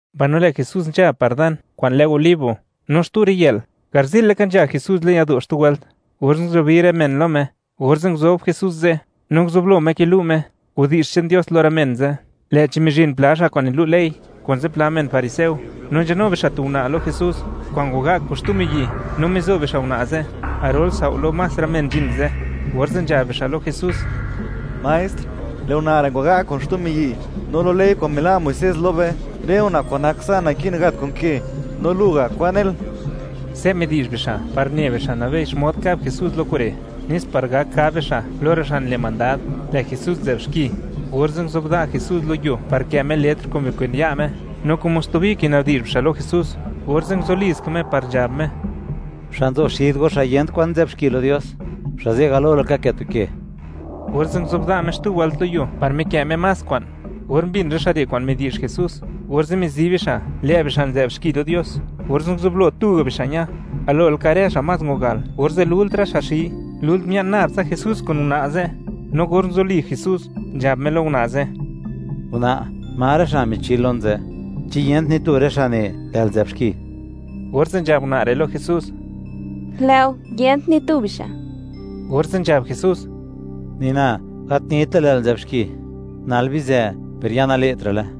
Mbaino lë' Jesús nzha par dan kwa'n lë Olivo. No xtu riyë'l, garzi'l laka nzha Jesús le'n yado' xtu wëlt, orze' nguzubi rë men lo Me; orze' nguzob Jesús ze' no nguzublo Me kilu' Me widi'zh che'n Dios lo rë men ze', lë'chi mizhin pla xa' kwa'n nilu' ley kun zipla men fariseo, no nzhanu bixa' tu una' lo Jesús kwa'n ngwaga' kun xtu miyi', no mizo bixa' una' ze' garol sao' lo más rë men nzhin ze', orze' nzhab bixa' lo Jesús: ―Maestr, lë' una' re' ngwaga' kun xtu miyi', no lo ley kwa'n mila' Muisés lo be, rë una' kwa'n nak sa' naki'n gat kun ke; no lu ga', ¿kwan nel? Se' midi'zh bixa' par ne bixa' nabei, xmod kab Jesús lo kure', nes par gak gab bixa' lo rë xa' nile' mandad, lë' Jesús nzë'b xki. Orze' nguzobda' Jesús lo yuo par kë' Me letr kun bikwen ya' Me, no como stubi kina'bdi'zh bixa' lo Jesús, orze' nguzuliska Me par nzhab Me: ―Xa' nzo xid go, xa' yent kwan nzë'b xki lo Dios, xa' ze' galo laka kë' tu ke. Orze' nguzobda' Me xtu wëlt lo yuo par mikë' Me más kwa'n. Or mbin rë xa' re' kwa'n midi'zh Jesús, orze' mizi bixa', lë' bixa' nzë'b xki lo Dios, orze' nguzublo tuga' bixa' ña, galo laka rë xa' más ngwagal orze' lult rë xa' xi, lult mia'n nab tsa Jesús kun una' ze'. No or nguzuli Jesús, nzhab Me lo una' ze': ―Una', ¿ma rë xa' michil lon ze'? ¿Chi yent ni tu rë xa' ne, lë'l nzë'b xki? Orze' nzhab una' re' lo Jesús: ―Lë' go, yent ni tu bixa'. Orze' nzhab Jesús: ―Ni na, gat nita lë'l nzë'b xki; nal bizë, per ya nale'tra'le.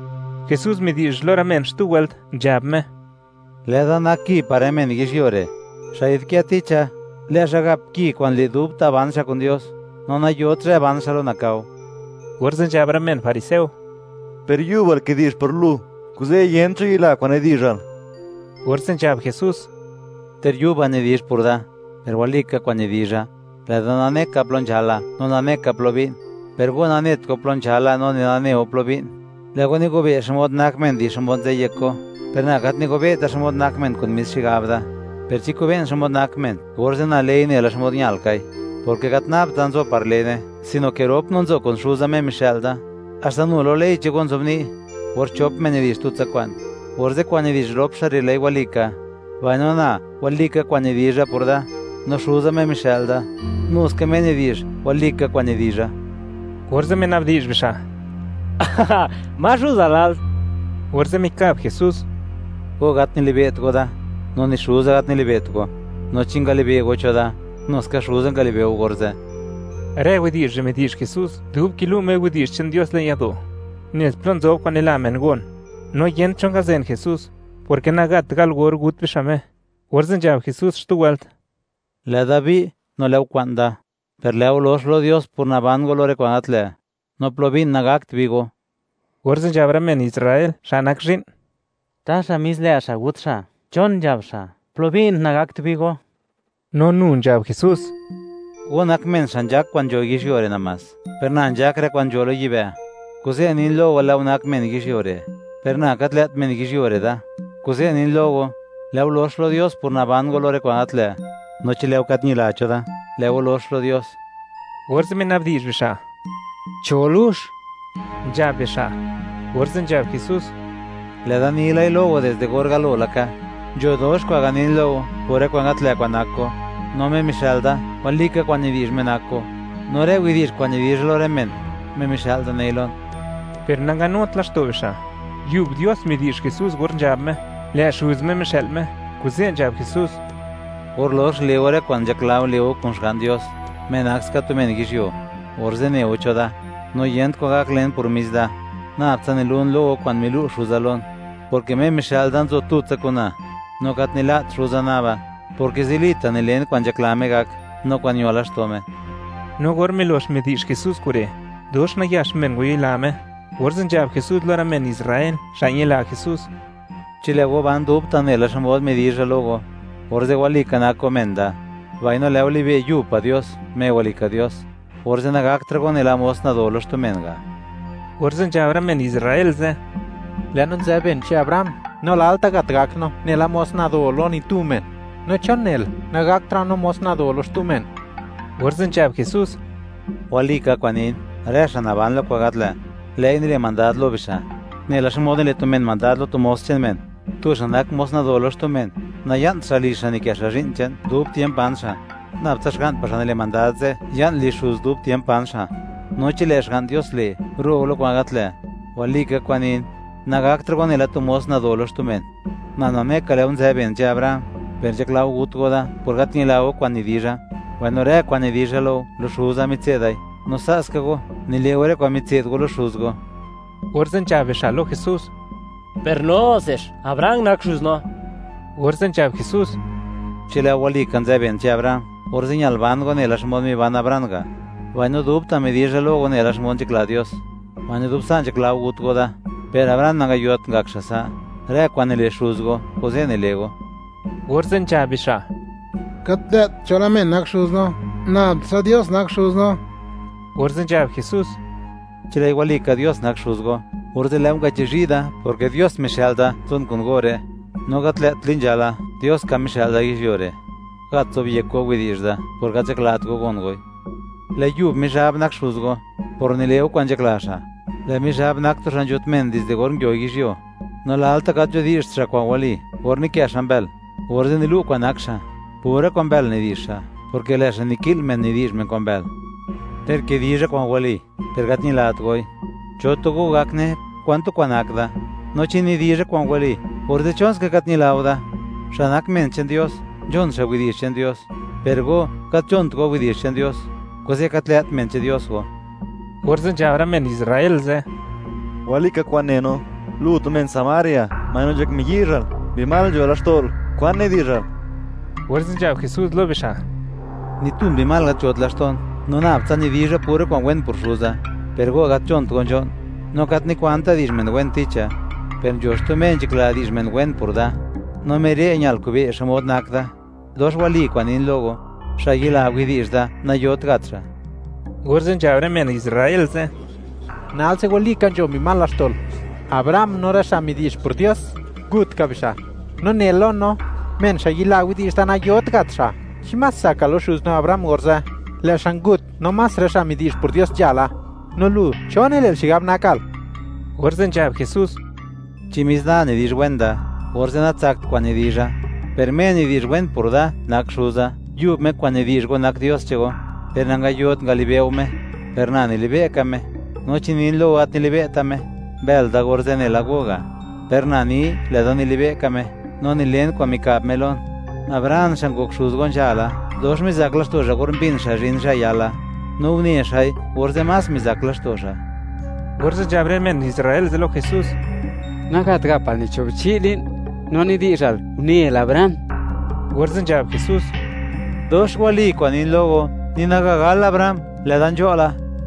Jesús midi'zh lo rë men xtu wëlt, nzhab Me: ―Lë'da nak ki par rë men yizhyuo re'; xa' yi'dkë ticha, lë' xa' gap ki kwa'n le', dubta' ban xa' kun Dios, no nayot zhë ban xa' lo nakao. Orze' nzhab rë men fariseo: ―Per yubal kidi'zh por lu, kuze' yent cho yila kwa'n nidi'zhal. Orze' nzhab Jesús: ―Ter yuba nidi'zh por da, per walika kwa'n nidizha; lë' da nane ka plo nzhala no nane ka plo bi'n; per go nanet go plo nzhala no ni nane go plo bi'n. Lë' go nigobe' xmod nak men di xmod nzë yek go, per na gat nigobe'ta xmod nak men kun mis xigab da, per chi kobe'n xmod nak men, orze' na lei nela xmod ñal kai, porke gat nabta' nzo par lene, sino ke rop no nzo kun Xuza, Me mixë'l da. Haxta nu lo ley che'n go nzobni', or chop men nidi'zh tutsa kwa'n, orze' kwa'n nidi'zh rop xa' re', lë'i walika. Mbaino na, walika kwa'n nidizha por da, no Xuza Me mixë'l da, nu ska Me nidi'zh, walika kwa'n nidizha. Orze' mina'bdi'zh bixa': ―¿Ma xuzal nal? Orze' mikab Jesús: ―Go gat nilibe't go da, no ni Xuza gat nilibe't go. No chi ngalibe' go cho da, nu ska Xuza ngalibe' go orze'. Rë widi'zh re' midi'zh Jesús dub kilu' Me widi'zh che'n Dios le'n yado', nez plo nzob kwa'n nila men gon; no yent cho ngazen Jesús, porke nagat gal or gut bixa' Me. Orze' nzhab Jesús xtu wëlt: ―Lë'da bi', no lë' go kwa'n da, per lë' go lox lo Dios por naban go lo rë kwa'n gat lë'; no plo bi'n, nagakt bi go. Orze' nzhab rë men Israel, xa' nak zhi'n: ―¿Taxa mis lë' xa' gut xa'? ¿Chon nzhab xa': “Plo bi'n nagakt bi go”? No nu nzhab Jesús: —Go nak men xa' nzhak kwa'n nzho yizhyuo re' namás, per na nzhak rë kwa'n nzho lo yibë'; kuze' nin lo go, lë' go nak men yizhyuo re', per na gat lë't men yizhyuo re' da. Kuze' nin lo go, lë' go lox lo Dios por naban go lo rë kwa'n gat lë'; no chi lë' go gat ñila cho da, lë' go lox lo Dios. Orze' mina'bdi'zh bixa': ―¿Cho lux? ―nzhab bixa'. Orze' nzhab Jesús: ―Lë'da nilai lo go, dizde or galo laka. Nzho dox kwa'n ganin lo go por rë kwa'n gat lë' kwa'n nak go; no Me mixë'l da, walika kwa'n nidi'zh Me nak go, no rë widi'zh kwa'n nidizha lo rë men, Me mixë'l da nei lon. Per nanganut laxto' bixa', yub Dios midi'zh Jesús or nzhab Me, lë' Xuz Me mixë'l Me, kuze' nzhab Jesús: ―Or lox le' go rë kwa'n nzhakla go le' go kun Xga'n Dios, Me nak ska tu men yizhyuo, orze' ne go cho da, no yent kwan gak len por mis da, nab tsa nilun lo go kwa'n milu' Xuza lon, porke Me mixë'l da nzo tutsa kun na; no gat nila't Xuza naba, porke zilita' nilen kwa'n nzhakla Me gak, no kwa'n ño laxto' Me. No or milox midi'zh Jesús kure', dox nayax men ngwayila Me. Orze' nzhab Jesús lo rë men Israel, xa' ñila Jesús: ―Chi lë' go ban dubta' nela xmod midizha lo go, orze' walika nak go men da, mbaino lë' go libe' Yub pa' Dios, Me walika Dios; orze' nagaktra' go nela mos nado lo xtu men ga'. Orze' nzhab rë men Israel ze': ―Lë' no nzë ben che'n Abraham, no lalta' gat, gak no nela mos nado lo ni tu men; no ¿chon nel, nagaktra' no mos nado lo xtu men? Orze' nzhab Jesús: ―Walika kwa'n nin, rë xa' naban lo kwa'n gat lë', lë'i nile' mandad lo bixa', nela xmod nile' tu men mandad lo tu mos che'n men. Tu xa' nak mos nado lo xtu men, naya'nt xa' lizh xa' nikë xa' zhi'n che'n dub tiemp ban xa'; nab tsa xga'n pa' xa' nile' mandad ze', ya'n lizh xuz dub tiemp ban xa'. No chi lë' Xga'n Dios le', ro' go lo kwa'n gat lë', walika kwa'n nin, nagaktra' go nela tu mos nado lo xtu men. Na nane ka, lë' go nzë ben che'n Abraham, per nzhakla go gut go da, por gat ñila go kwa'n nidizha. Mbaino rë kwa'n nidizha lo go, lo Xuza mitse'dai; no sa' ska go, nile' go rë kwa'n mitse'd go lo xuz go. Orze' nzhab bixa' lo Jesús: ―Per no se, ¡Abraham nak xuz no! Orze' nzhab Jesús: ―Chi lë' go walika nzë ben che'n Abraham, orze' ñal ban go nela xmod miban Abraham ga', mbaino dubta' midizha lo go nela xmod nzhakla Dios, mbaino dub sa' nzhakla go gut go da; ¡per Abraham nangayot ngak xa' sa'! Rë kwa'n nile' xuz go kuze' nile' go. Orze' nzhab bixa': ―Gat lë't chola men nak xuz no; ¡nab tsa Dios nak Xuz no! Orze' nzhab Jesús: ―Chi lë'i walika Dios nak Xuz go, orze' lë' go ngachizhi' da, porke Dios mixë'l da, nzon kun go re'; no gat lë't tli nzhala, Dios ka mixë'l da yizhyuo re'. Gat nizobyekt go widi'zh da por gat nzhaklat go gon goi. Lë' yub Mizhab nak xuz go, por nile' go kwa'n nzhakla xa'. Lë' Mizhab nak tu xa' nzhut men dizde or nguio yizhyuo, no lalta' gat nzhudi'zht xa' kwa'n wali. Or nikë' xa' mbël, orze' nilu' kwan nak xa'; pura kwa'n mbël nidi'zh xa' porke lë' xa' niki'l men nidi'zh men kwa'n mbël. Ter kidizha kwa'n wali, per gat ñilat goi. ¿Cho tu go gak ne, kwan tu kwa'n nak da? No chi nidizha kwa'n wali, orze', ¿chonska gat ñila go da? Xa' nak men che'n Dios, nzhon xa' widi'zh che'n Dios, per go, gat nzhont go widi'zh che'n Dios, kuze' gat lë't men che'n Dios go. Orze' nzhab rë men Israel ze': ―¡Walika kwa'n ne no: Lu tu men Samaria, mbaino nzhak miyizhal, mbi mal nzho laxto'l! ¿Kwan nidi'zhal? Orze' nzhab Jesús lo bixa': ―Ni tu mbi mal gat nzhot laxto'n, no nab tsa nidizha pura kwa'n wen por Xuza; per go gat nzhont go nzho'n. Na gat nikwanta' di'zh men wen ticha, per nzho xtu Me nzhakla di'zh men wen por da, no Me re' ñal kobe' (wi') xmod nak da. Dox wali kwa'n nin lo go, xa' yila widi'zh da, nayot gat xa'. Orze' nzhab rë men Israel ze': ―¡Nalse walika, nzho mbi mal laxto'l! Abraham no rë xa' midi'zh por Dios, ngut ka bixa', no nel lo no: “¡Men xa' yila widi'zh da nayot gat xa'!” ¿Chi más tsakal lo xuz no Abraham orze'? Lë' xa' ngut, no más rë xa' midi'zh por Dios nzhala, no lu, ¿cho nile'l xigab nakal? Orze' nzhab Jesús: ―Chi mis da nidizh wen da, orze' natsakt kwa'n nidizha; per Me nidi'zh wen por da nak Xuza; yub Me kwa'n nidi'zh go nak Dios che'n go, per nangayot ngalibe' go Me, per na nilibe' ka Me. No chi nin lo go, gat nilibe'ta' Me, mbël da orze' nela go ga'. Per na ni, lë'da nilibe' ka Me, no nilen kwa'n mika'b Me lon. Abraham xa' ngok xuz go nzhala, dox mizak laxto' xa' or mbin xa' zhin zhë yala, no une xa'i, orze' más mizak laxto' xa'. Orze' nzhab rë men Israel ze' lo Jesús: ―Nagat gapal ni cho' bichi' li'n, ¿no nidi'zhal, unel Abraham? Orze' nzhab Jesús: ―Dox wali kwa'n nin lo go, ni naga gal Abraham, lë'da nzho' la.